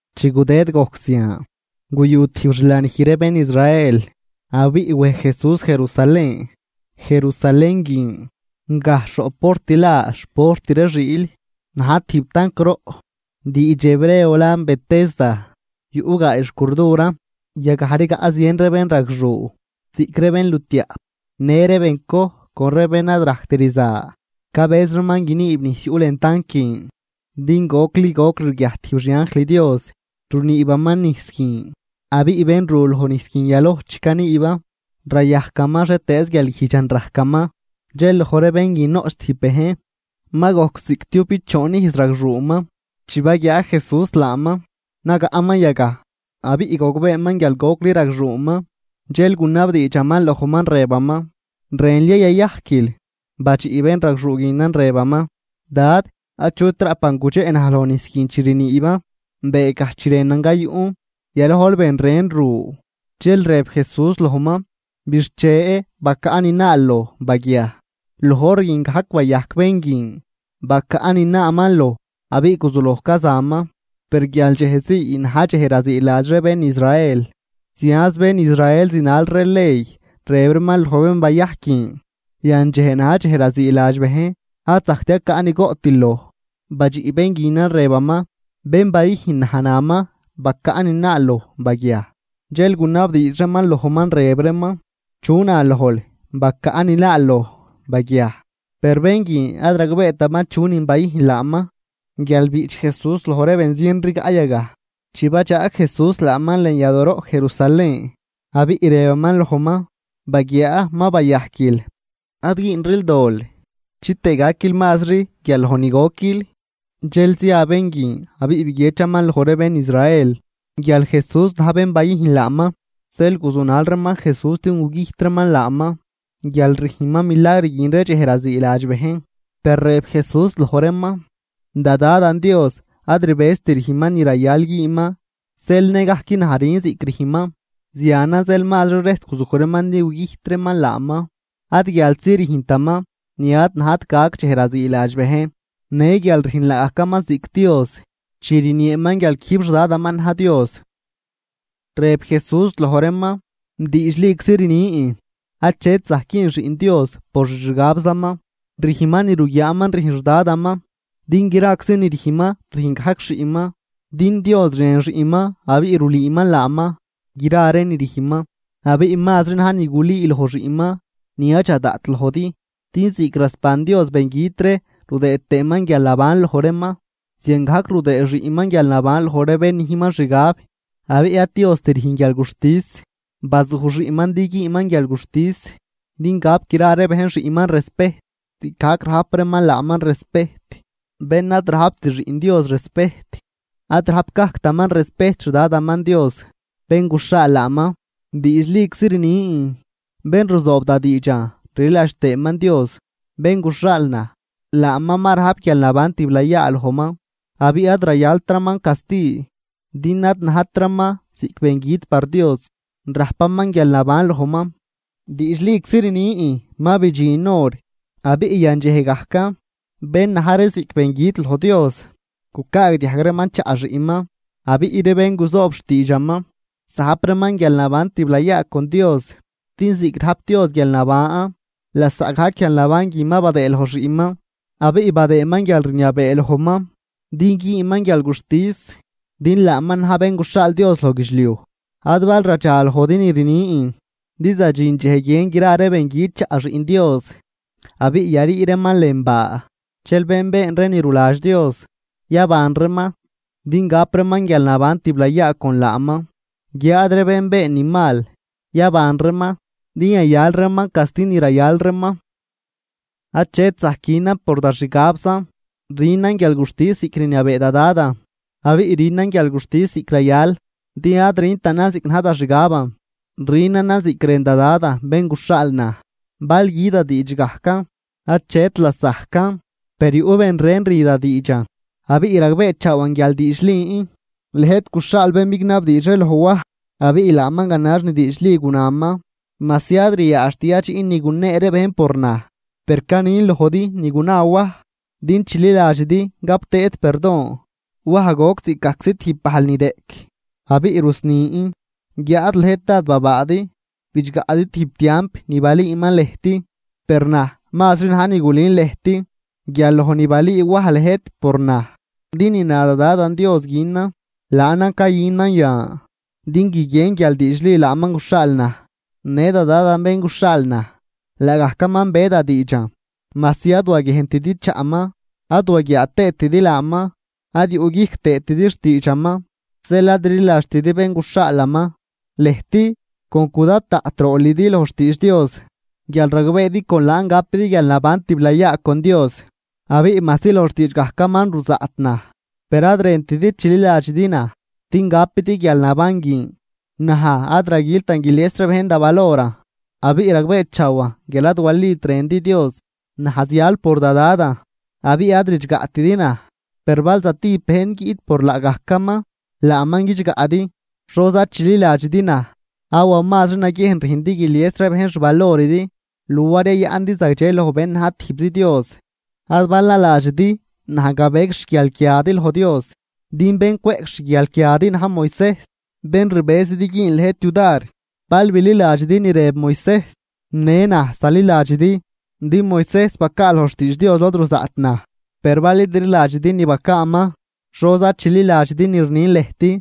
Chi gudëd gojc zian, guyu tijb xlanij ree bén Israel, abiꞌ wej Jesús Jerusalén. Jerusalén guin, gajxh roꞌ port la xport ree Xiil, na̱j tijb tanc roꞌ, diidx hebreo lan Betesda, yuꞌ gaay xcurduran. Yagaj rigaꞌ zien ree bénragxuu, ziꞌc ree bénlutiaꞌp, në ree bencoj con ree bén ad rajctczi rza, cabëz reeman guiniib nijs yuꞌ lën tanc guin. Din gocli goc rguiajt tijb xianjl Dios runiibaman nijs guin, abiꞌ bén ru lojnijs guin yaloj chi caniiban, rayajcaman xhietëëz guialguijdxan rajcaman. Dxel loj ree bén guin noꞌch tijb bejn, ma gojc ziꞌctiubichoon ijz ragxuuman. Chi baguiaa Jesús laaman nagaꞌman yagaj, abiꞌ gogbeeman guial gocli ragxuuman dxel gunabdiidxaman lojman rëbaman: ―¿Rënl ya yayajquil? Badxiꞌ bénragxuu guinan rëbaman: ―Dad, achut raꞌpan gudxeꞌ naj loj nijs guin chi riniiban. Beegaj chi rënan gayuꞌn, yalojl ben ren ru. Dxel rëb Jesús lojman: ―Bixche, bacaꞌ ni naal loj, baguiaj. Loj hor guin gajc bayajc bén guin, bacaꞌ ni naaman loj abiꞌ guzuloj cazaman. Per guial dxej zii na̱j dxej raziiladx ree bén Israel, zianz bén Israel zinal ree ley rëb reeman loj bén bayajc guin: ―Yandxej na̱j dxej raziiladx bejn, ad zajct yacaꞌ ni goꞌtil loj. Badxiꞌ bén guinan rëbaman: ―Bén bayüjn naj naman: “Bacaꞌ ni naal loj, baguiaj.” Dxel gunabdiidx reeman lojman rëb reeman: ―¿Chu na lojl: “Bacaꞌ ni naal loj, baguiaj”? Per bén guin ad ragbeetaman chunin bayüjn laaman guial biꞌch Jesús loj ree benzien rigaꞌ yagaj. Chi badxaag Jesús laaman lën yadooroꞌ Jerusalén, abiꞌ rëbaman lojman: ―Baguiaa ma bayajquil, ad güünril dol chitëë gaquil mazri guial loj ni goquil. Dxel zia bén guin abiꞌ biguiedxaman loj ree bén Israel guial Jesús na̱j bén bayüjn laaman. Zeel guzunal reeman Jesús din gugüjt reeman laaman, guial rüjnman milagr guin ree dxej raziiladx bejn. Per rëb Jesús loj reeman: ―Da Dadan Dios ad rbëzt rüjnman ni rayal güünman, zeel nëgajc naj rün ziꞌc rüjnman. Zianan zeel mazri rejs guzuj reeman din gugüjt reeman laaman, ad guialzi rüjntaman ni ad najt gac dxej raziiladx bejn, në guial rüjn laagajcaman ziꞌc Dios chi rnieeman guial quijb xDadaman na̱j Dios. Rëb Jesús loj reeman: ―Diidxliczi rnin, achet zajc güün Xiꞌn Dios por xixgabzaman, rüjnman ni ruguiaaman rüjn xDadaman. Din graczi ni rüjnman rüjn gajc xiꞌnman. Din Dios rën xiꞌnman abiꞌ rulüüman laaman gra ree ni rüjnman. Abiꞌ mazri na̱j ni gulüü loj xiꞌnman ni yadxa daꞌt lojdi. Din ziꞌc rasban Dios bengüt ree rudëë tëëman guialnaban loj reeman, ziangajc rudëë xiꞌnman guialnaban loj ree bén nüjnman xgab. Abiꞌ ad Diost rüjn guialguxtis, bazuj xiꞌnman din güünman guialguxtis, din gap gra ree bejn xiꞌnman respejt ziꞌcgajc rajp reeman laaman respejt. Bén ad rajpt Xiꞌn Dios respejt, ad rajp gajctaman respejt xDadaman Dios, bén guxhaal laaman. ’Diidxliczi rnin: Bén ruzoob da diidxan rliladx tëëman Dios, bén guxhaal naj, laaman ma rajp guialnaban tiblayaa lojman. Abiꞌ ad rayaltraman casti din ad najtraman ziꞌc bengüt par Dios, rajpaman guialnaban lojman. Diidxliczi rnin ma bidxin hor, abiꞌ yandxej gajcan, bén na̱j ree ziꞌc bengüt loj Dios gucaagdiajg reeman chaꞌ xiꞌnman. Abiꞌ ree bén guzoob xtiidxaman zajp reeman guialnaban tiblayaa con Dios. Din ziꞌc rajp Dios guialnaban, lasaꞌgajc guialnaban guin ma badëë loj xiꞌnman, abiꞌ badëëman guialrniabee lojman din güünman guialguxtis, din laaman na̱j Bén guxhaal Dios loj guidxliuj. Ad bal radxa lojdi ni rnin, din zadxin dxej guien gra ree bengüt chaꞌ Xiꞌn Dios, abiꞌ yarii reeman lën baa. Dxel bén been ree ni ruladx Dios, yaban reeman, din gap reeman guialnaban tiblayaa con laaman. Guiáad ree bén been ni mal, yaban reeman din yayal reeman casti ni rayal reeman. ’Achet zajc günan por da xgabzan, rünan guialguxtis ziꞌc rniabee da Dadan. Abiꞌ rünan guialguxtis ziꞌc rayal, din ad rüntanan ziꞌc na̱j da xgaban, rünanan ziꞌc rën da Dadan bén guxhaal naj. Bal gü da diidx gajcan, achet lasajcan. Per yuꞌ ben ren rü da diidxan, abiꞌ ragbeechaawan guial diidxlin. Lëjt guxhaal bén bignabdiidx ree loj Waj, abiꞌ laaman ganax ni diidxli gunaman. Majsi ad ryaadxt yadxiꞌn ni gunee ree bejn por naj, per canin lojdi ni guna Waj din chililadxidi gap tëëdi perdon. Waj goc ziꞌcgajczi tijb bajl ni reꞌc abiꞌ rusnin, guiáad lëjt dád babaadi bidxgaꞌdi tijb tiamp ni balüüman lëjt. Per naj mazri na̱j ni gulün lëjt guial loj ni balüü Waj lëjt por naj. Din ni na da Dadan Dios günan, laanan cayünan yan din guiguien guial diidxli laaman guxhaal naj. Në da Dadan bén guxhaal naj, laagajcaman be da diidxan, majsi ad waguiejntidi chaꞌman ad waguiaa tëëtidi laaman. Ad yuꞌguijc tëëtidi xtiidxaman zeel ad rliladxtidi bén guxhaalaman. Lëjt con cudad daꞌt roolidi loj xtiidx Dios, guial ragbeedi con laan gapidi guialnaban tiblayaa con Dios. Abiꞌ majsi loj xtiidx gajcaman ruzaꞌt naj, per ad rëntidi chililadxidi naj din gapidi guialnaban guin. ’Naj ad raguiltan guilies ree bejn da valoran. Abiꞌ ragbeechaawan guial ad walit rëndi Dios. Naj zial por da Dadan abiꞌ ad ridxgaꞌtidi naj. Per bal stijb bejn guiꞌt por laagajcaman, laaman guidxgaꞌdi. ¿Xoza chililadxidi naj? Awa mazri naguiejn rüjndi guilies ree bejn xvaloridi luar yayaꞌndi zagdxe loj bén na̱j tijbzi Dios. Ad bal naladxidi naj gabec xguialquiadi loj Dios, din bén cweꞌc xguialquiadi na̱j Moisejs, bén rbëzidi güün lëjt yudar. Bal bililadxidi ni rëb Moisejs, në naj zaliladxidi, din Moisejs bacaa loj xtiidx Dios lod ruzaꞌt naj. Per bal id rliladxidi ni bacaaman, ¿xoza chililadxidi ni rnin lëjt?